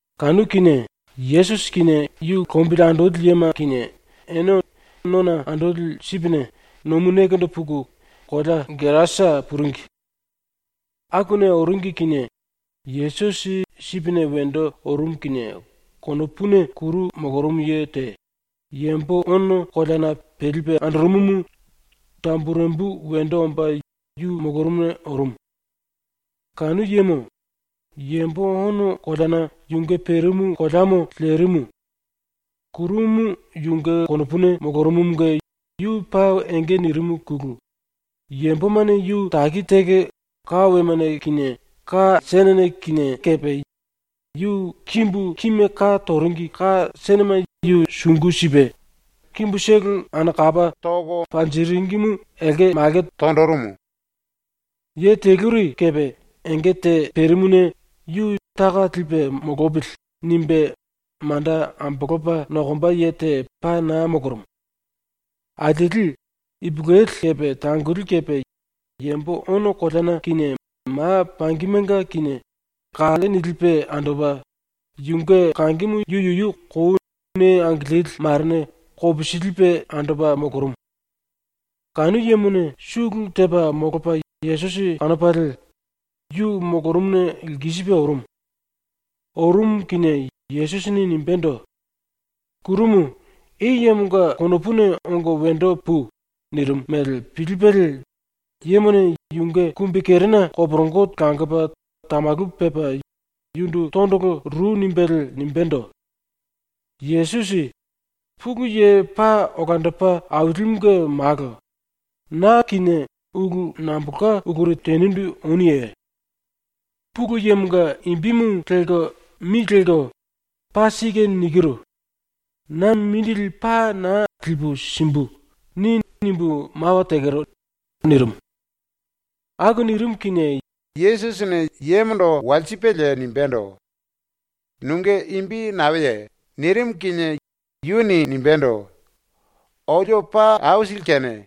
Kanu kinie, ⸤Yesusi kinie yu lombili andoli yema kinie⸥ ene ⸤nona andoli sipine⸥ nomu nekendo puku kolea Gerasa puringi. Akuna oringi kinie Yesusi sipine wendo orumu kinie konopuna kuru molorumu ye te, yambo ono koleana pelipe andorumumu tamburembu wendo omba yu molorumuna orumu. Kanu yemo, yambo ono koleana yunge perimu koleamo lerimu. ⸤Kurumu yunge konopuna molorumumunge yu paa enge nirimuna⸥ yambomane yu taki taki ka wemane kinie, ka senene kinie kepe yu kimbu kime ka toringi ka senema yu sungu sipe, kimbutolo anakapa panjiringimu elke malke tonjirimu. Ye teluri kepe enge te perimuna ‘Yu taka lepa molopili.’ nimbe manda ambolopa nokomba ye te paa naa molorumu. Alieli, ipulueli kepe tangoli kepe, yambo ono koleana kinie ma pangimenga kinie kalle nilipe andopa, yunge kangimu yu yuyu kou ⸤nee angilili⸥ marene kopisilipe andopa molorumu. Kanu yemone sulu tepa molopa Yesusi kanopalie yu molorumuna lkisipe orumu. ⸤Orumu kinie⸥ Yesusini nimbendo: “Kurumu, i yemonga konopuna ongo wendo pui!” nirimu mele pilipelie yemone yunge kumbikerena koporongo langopa tamalu pepa yundu tondolo ru nimbelie nimbendo: “Yesusi, Pulu Ye Paa Olandopa Ailimunge Malo, na kinie ulu nambolka uluri tenindu onuye? ‘Pulu Yemonga imbimu lelko mi lelko “Paa sike nikiru. Na mindili paa naa lipu simbu.” ni!’ nimbu mawa tekero.” nirimu. Aku nirimu kinie Yesusini yemondo walsipelie nimbendo: “Nunge imbi naeye?” nirimu kinie yuni nimbendo: “⸤Olio paa aisili kene⸥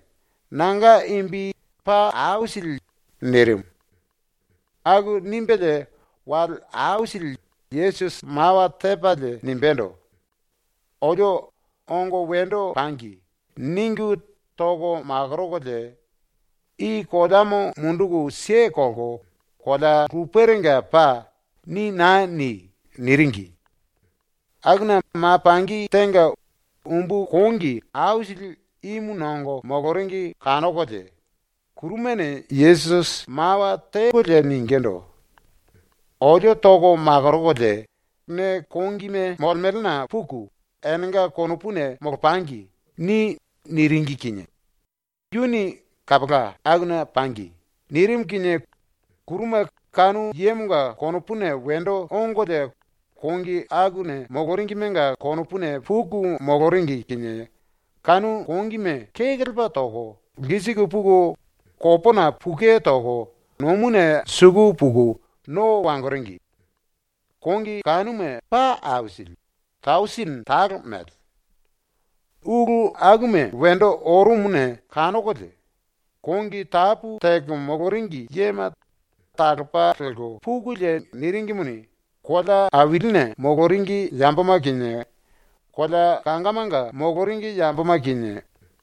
nanga imbi Paa Aisili.” nirimu. Aku nimbelie wale aisili Yesusi mawa tepalie nimbendo: “Olio ‘ongo wendo pangi.’ ningu toko makorokolie “I koleamo munduku kelko kolea luperenga pai.” ni naa ni.” niringi. Akuna ma pangi tenga umbu kongi aisili ímu nongo moloringi kanokolie kurumane Yesusi mawa tekolie ningindu: “Olio ⸤toko makorokolie⸥ “Ne kongime molemelena puku, enenga konopuna molopangi.” ni.” niringi kinie yuni “Kapola, akuna pangi.” nirimu kinie kuruma kanu yemonga konopuna wendo ongolie kongi akuna moloringimenga konopuna puku moloringi kinie kanu kongime kekelepa toko lkisiku puku kopona pukue toko nomuna suku puku no wangoringi. Kongi kanuma ⸤paa aisili,⸥ tausini talo mele. ⸤Ulu akuma wendo orumuna kanokolie⸥ kongi tapu teko moloringi yema talopa lelko pukulie niringimuni, kolea ailine moloringi yamboma kinie, kolea kangamanga moloringi yamboma kinie,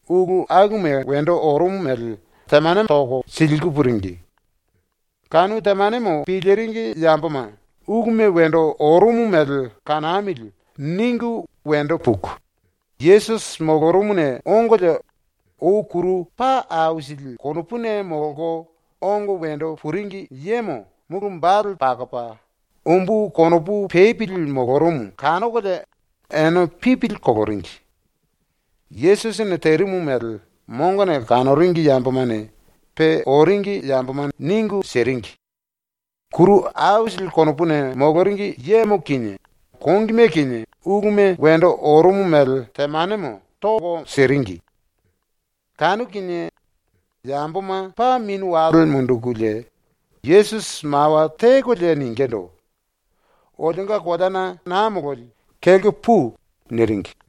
ulu akuma wendo orumu mele temane toko siliku puringi. Kanu temanemo piliringi yamboma ‘Uluma wendo orumu mele kanamili.’ ningu wendo puku Yesusi molorumuna ongolie ou kuru paa aisili konopuna molko ongo wendo puringi yemo mulu wambale pakopa, umbu konopu pepili molorumu kanokolie ene pipili koloringi. Yesusini terimu mele mongone kanoringi yambomane pe oringi yamboma ningu siringi. Kuru aisili konopuna moloringi yemo kinie, kongime kinie uluma wendo orumu mele temanemo toko siringi. Kanu kinie yamboma ⸤paa mini wale mundukulie⸥ Yesusi mawa tekolie ningindu: “Olionga koleana naa mololi kelko pui.” niringi.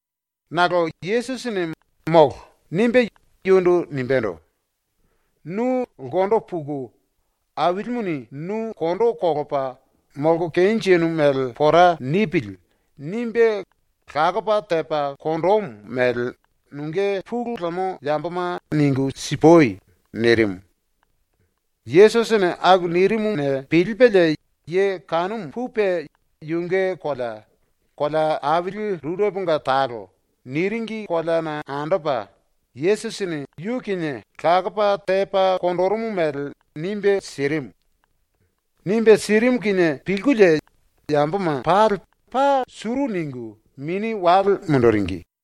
Nakolo Yesusini “Molo.” nimbe yundu nimbendo: “Nu ulkendo puku Ailimuni nu kondo kolopa ‘Molko kenjinu mele pora nipili.’ nimbe, lakopa tepa konjimu mele nunge pulu lemo yamboma ningu sipui.” nirimu. Yesusini aku nirimuna pilipelie ye kanumu pupe yunge kolea, ‘Kolea Aili Rureponga Talo’ niringi koleana andopa Yesusini lakopa tepa konjirimu mele nimbe sirimu. Nimbe sirimu kinie pilkulie yamboma pali paa suru ningu mini wale munduringi.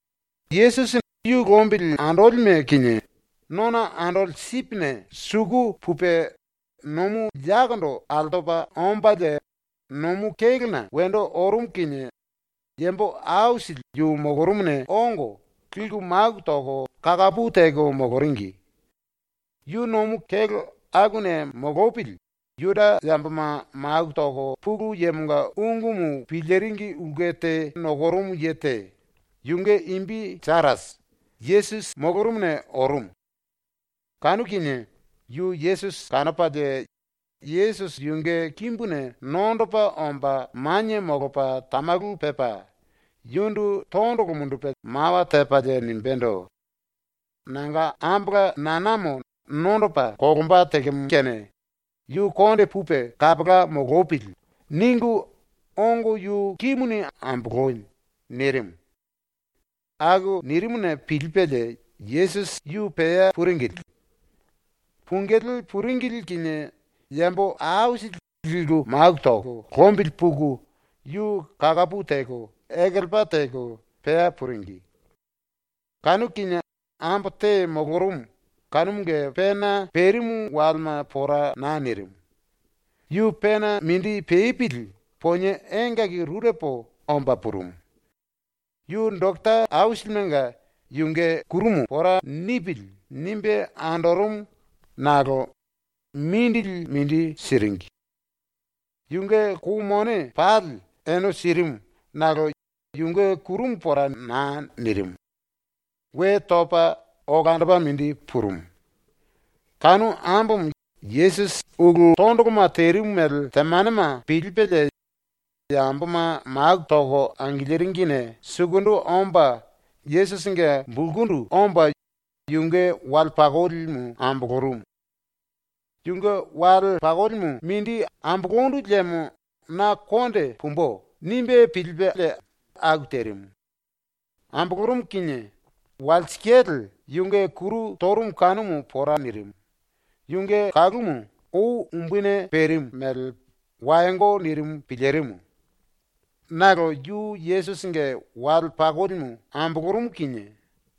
Yesusi ⸤yu lombili andolime kinie⸥ nona andoli sipine suku pupe nomu yakondo altopa ombalie nomu kélona wendo orumu kinie yambo aisili yu molorumuna ongo liku maku toko kakapu teko moloringi. Yu nomu kélo akuna molopili Juda yamboma maku toko Pulu Yemonga ungumu piliringi ulke te nokorumu ye te, yunge imbi Jairasi, Yesusi molorumuna orumu. Kanu kinie yu Yesusi kanopalie Yesusi yunge kimbuna nondopa omba manie molopa tamalu pepa yundu tondolo mundupe mawa tepalie nimbendo: “Nanga ambola nanamo nondopa kolomba tekemo kene ‘Yu konde pupe kapola molopili.’ ningu ongo yu kimuni amboloi.” nirimu. Aku nirimuna pilipelie Yesusi yu pea puringili. Pungilí puringili kinie yambo aisili liku maku toko lombili puku yu kakapu teko ekelepa teko pea puringi. Kanu kinie ambo te molorumu kanumunge pena perimu walema pora naa nirimu. Yu pena mindi pepili ponie engaki rurepo omba purumu. Yu doketa aisilimenga yunge kurumu ‘Pora nipili.’ nimbe andorumu nakolo mindili mindi siringi. Yunge kou mone pali ene sirimu nakolo yunge kuru pora naa nirimu. We topa olandopa mindi purumu. Kanu ambomo Yesusi ulu tondoloma terimu mele temanema pilipelie yamboma maku toko angiliringine sukundu omba Yesusinge bulkundu omba yunge wale pakolimu ambolorumu. ‘Yunge wale pakolimu mindi ambolondu liemo na konde pumbu.’ nimbe pilipelie aku terimu. ⸤Ambolorumu kinie⸥ walsikale yunge kuru torumu kanumu pora nirimu, yunge kangimu ou umbuni perimu mele wayongo nirimu pilirimu. Nakolo ⸤yu Yesusinge wale pakolimu ambolorumu kinie⸥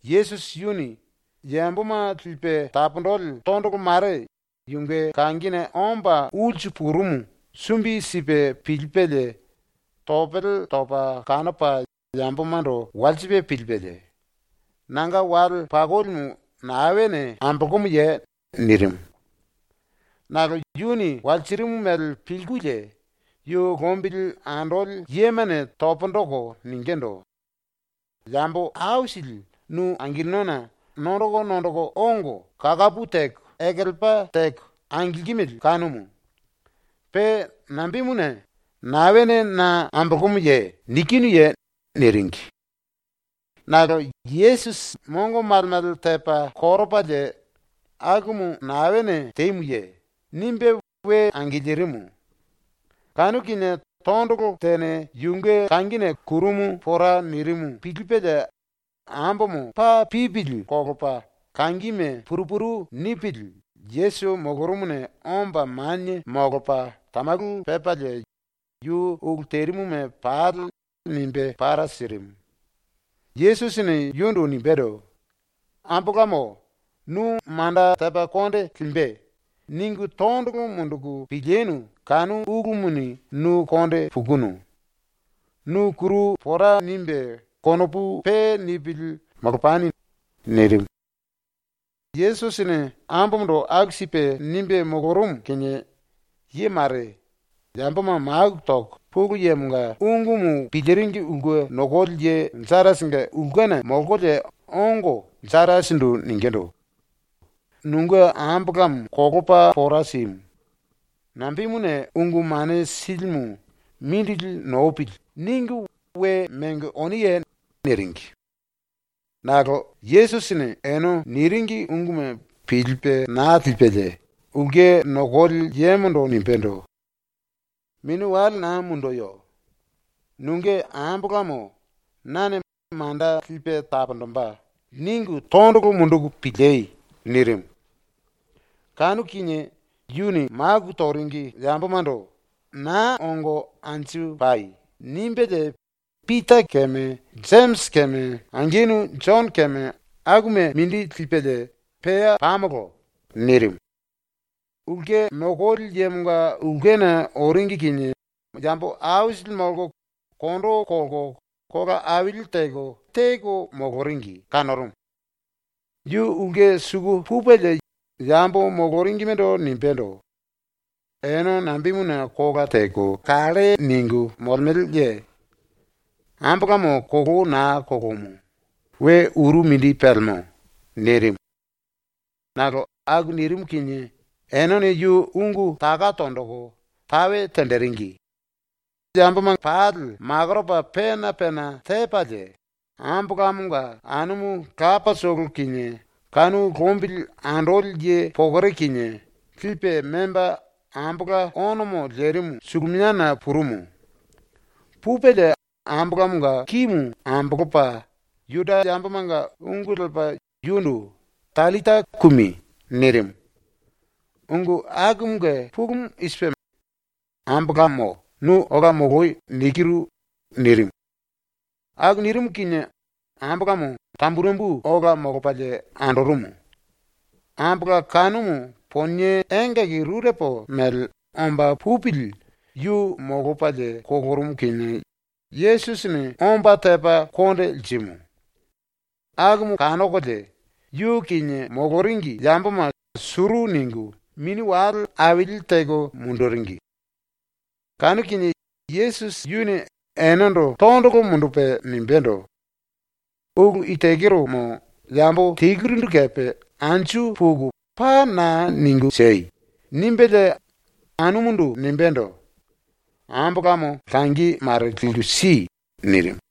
Yesusi yuni yamboma lipe taponjili tondolo mare yunge kangine omba ulsu purumu sumbi sipe pilipelie topele topa kanopa yambomando walsipe pilipelie, “Nanga wale pakolimu naene ambolomuye?” nirimu. Nakolo ⸤yuni walsirimu mele pilkulie⸥ yu lombili andoli yemane pundu toko ningindu: “Yambo aisili nu angilinona nondoko nondoko ongo kakapu teko ekelepa teko angilkimili kanumu. Pe nambemuna “Naene na ambolomuye?” nikinuye?” niringi. Nakolo Yesusi mongo male male tepa koropalie “Akumu naene temuye?” nimbe we angilirimu. Kanu kinie tondolo tene yunge kangine kurumu pora nirimu pilipelie ambomo paa pipili kolopa kangime puru puru nipili Yesusi molorumuna omba manie molopa tamalu pepalie yu ulu terimuma pali nimbe para sirimu. Yesusini yundu nimbendo: “Ambolamo, ‘Nu manda tepa konde limbe.’ ningu tondolo munduku pilinu kanu ulumuni nu konde pukunu. Nu kuru pora nimbe konopu pe nipili molopani.” nirimu. Yesusini ambomondo aku sipe nimbe molorumu kinie, ye mare, yamboma maku toko Pulu Yemonga piliringi ulke nokoli ye Jairasinge ulkena molkolie ongo ⸤Jairasindu⸥ ningindu: “Nunge ambolamo kolopa pora simu. Nambemuna Ungu Mane Silimu ‘Mindili nopili.’ ningu we mengo oniye?” niringi. Nakolo Yesusini ene niringi ungumu pilipe naa lipelie ulke nokoli yemondo nimbendo: “Mini wale naa munduyo. ⸤Nunge ambolamo nane ‘Manda lipe taponjimbe.’ ningu⸥ tondolo munduku pilí.” nirimu. Kanu kinie yuni maku toringi yambomando “Naa ongo anju pai.” nimbelie Pita keme Jemisi keme angenu Jono keme akuma mindi lipelie “Pea pamolo.” nirimu. Ulke nokoli yemonga ulkena oringi kinie yambo aisili molko kondo kolko kola aili teko teko moloringi kanorumu. Yu ulke suku pupelie yambo moloringimendo nimbendo: “Ene nambemuna kola teko kalle ningu molemeleye? Ambolamo kolou naa kolomu. We uru mindi pelemo.” nirimu. Nakolo aku nirimu kinie enene yu ungu taka tonjiku tae tenjiringi. Ene pali makoropa pena pena tepalie, ambolamonga anumu lapatolo kinie, kanu lombili andoli ye pokore kinie lipe memba ambola onomo lerimu suluminiana purumu. Pupelie ambolamonga kimu ambolopa Juda yambomanga ungu lepa yundu “Tallita kumi!” nirimu. (Ungu akumunge pulumu i sipe: “ “Ambolamo, nu ola moloi.” nikiru.” nirimu.) Aku nirimu kinie ambolamo tamburembu ola molopalie andorumu. (Ambola kanumu ponie engaki rurepo mele omba pupili yu molopalie kolorumu kinie Yesusini omba tepa konde lirimu.) ⸤Akumu kanokolie⸥ yu kinie moloringi yamboma suru ningu mini wale aili teko munduringi. Kanu kinie Yesusi yuni enendo tondolo mundupe nimbendo: “Ulu i tekeromo yambo telurindu kepe anju puku paa naa ningu siei!” nimbelie ⸤anumundu⸥ nimbendo: “Ambolamo langi mare liku si.” nirimu.